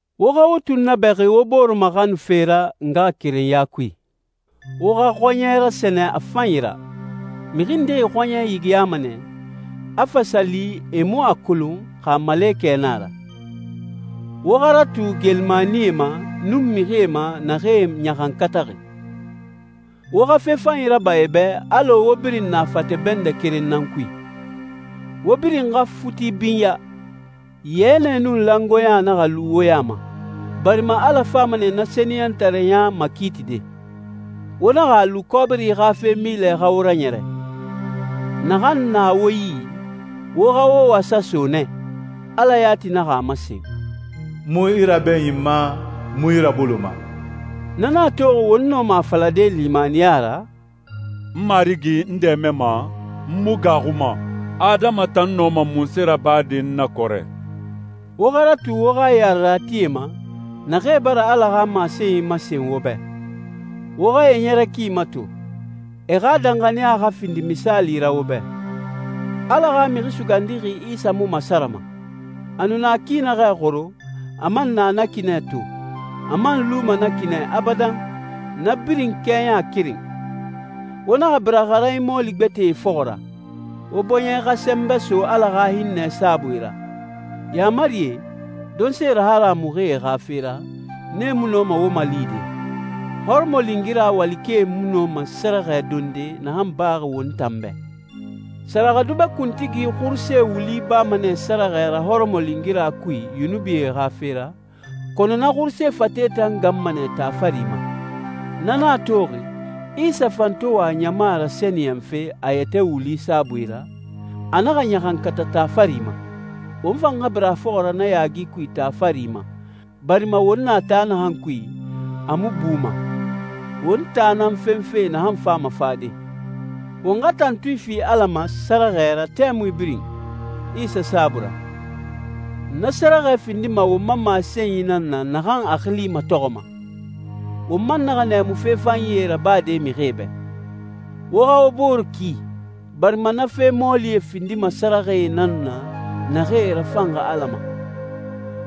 Wo xa wo tunnabɛxi wo bore maxanufe ra ngaxakerenya kui. Wo xa xɔɲɛ rasɛnɛ a fanyi ra. Mixi ndee xɔɲɛ yigiyama nɛ, a fa sa li e mu a kolon xa malekɛ na a ra. Wo xa ratu geelimanie ma nun mixie ma naxee ɲaxankataxi. Wo xa fe fanyi raba e bɛ alɔ wo birin na fate bɛndɛ keren nan kui. Wo birin xa futi binya. Yɛnɛ nun langoeɲa naxa lu wo ya ma, barima Ala fama nɛ na sɛniyɛntareɲa makiitide. Wo naxa a lu kɔbiri xa fe milɛ xa wo raɲɛrɛ. Naxan na wo yi, wo xa wo wasa so nɛ. Ala yati naxa a masen, «N mu i rabɛɲinma, n mu i raboloma.» Na nan a toxi won nɔma a falade limaniya ra, «N Marigi n dɛmɛnma, n mu gaaxuma. Adama tan nɔma munse rabade n na kɔrɛ?» Wo xa ratu wo xa yareratie ma, naxee bara Ala xa masenyi masen wo bɛ. Wo xa e ɲɛrɛ ki mato, e xa danxaniya xa findi misaali ra wo bɛ. Ala xa Mixi Sugandixi Isa mu masarama. A nu na ki naxɛ xoro, a man na na ki nɛ to, a man luma na ki nɛ abadan, na birin kɛɲa keren. Wo naxa bira xaranyi mɔɔli gbɛtɛe fɔxɔ ra. Wo bɔɲɛ xa sɛnbɛ so Ala xa hinnɛ saabui ra. Yaamarie, donse raharamuxie xa fe ra, nee mu nɔma wo malide. Hɔrɔmɔlingira walikɛe mu nɔma sɛrɛxɛ donde naxan baxi won tan bɛ. Sɛrɛxɛdubɛ kuntigi xuruse wuli bama nɛ sɛrɛxɛ ra hɔrɔmɔlingira kui yunubie xa fe ra, kɔnɔ na xuruse fate tan ganma nɛ taa fari ma. Na nan a toxi, Isa fan to wa ɲama rasɛniyɛnfe a yɛtɛ wuli saabui ra, a naxa ɲaxankata taa fari ma. Won fan xa bira a fɔxɔ ra na yaagi kui taa fari ma, barima won na taa naxan kui, a mu buma. Won taa nan fenfe naxan fama fade. Won xa tantui fi Ala ma sɛrɛxɛ ra tɛmui birin Isa saabui ra. Na sɛrɛxɛ findima won ma masenyi nan na naxan a xili matɔxɔma. Wo man naxa nɛɛmu fe fanyie rabade mixie bɛ. Wo xa wo booree ki, barima na fe mɔɔlie findima sɛrɛxɛe nan na naxee rafanxi Ala ma.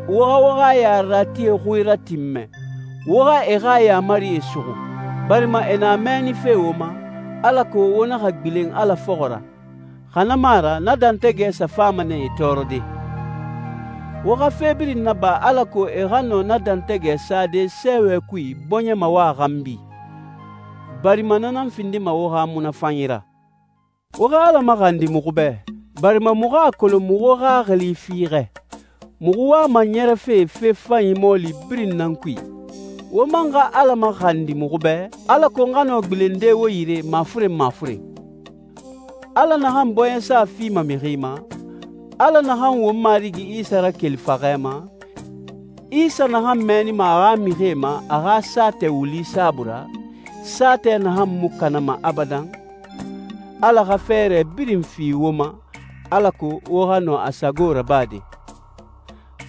Wo xa wo xa yareratie xui ratinmɛ, wo xa e xa yaamarie suxu, barima e na mɛɛnife wo ma, alako wo naxa gbilen Ala fɔxɔ ra, xa na mu a ra na dɛntɛgɛ sa fama nɛ e tɔɔrɔde. Wo xa fe birin naba alako e xa nɔ na dɛntɛgɛ sade sɛɛwɛ kui bɔɲɛ mawa xanbi, barima na nan findima wo xa munafanyi ra. Wo xa Ala maxandi muxu bɛ, barima muxu a kolon muxu xaxili fiixɛ, muxu wama ɲɛrɛfe fe fanyi mɔɔli birin nan kui. Wo man xa Ala maxandi muxu bɛ, alako n xa nɔ gbilende wo yire mafuren mafuren. Ala naxan bɔɲɛsa fima mixi ma, Ala naxan won Marigi Isa rakeli faxɛ ma, Isa naxan mɛɛnima a xa mixie ma a xa saatɛ wuli saabui ra, saatɛ naxan mu kanama abadan, Ala xa fɛɛrɛ birin fi wo ma alako wo xa nɔ a sago rabade.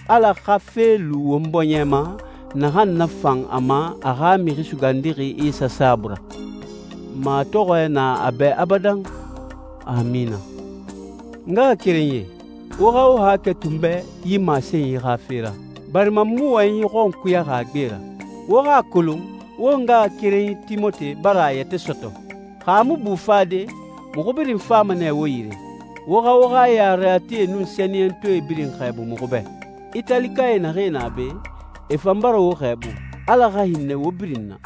Ala xa fe lu won bɔɲɛ ma naxan nafan a ma a xa Mixi Sugandixi Isa saabui ra. Matɔxɔɛ na a bɛ abadan. Amina. N ngaxakerenyie, wo xa wo haakɛ to n bɛ yi masenyi xa fe ra, barima n mu wɔyɛnyi xɔnkuyaxi a gbe ra. Wo xa a kolon won ngaxakerenyi Timote bara a yɛtɛ sɔtɔ. Xa a mu bu fade, muxu birin fama nɛ wo yire. Wo xa wo xa yareratie nun sɛniyɛntɔɛ birin xɛɛbu muxu bɛ. Italikae naxee na be, e fan bara wo xɛɛbu. Ala xa hinnɛ wo birin na.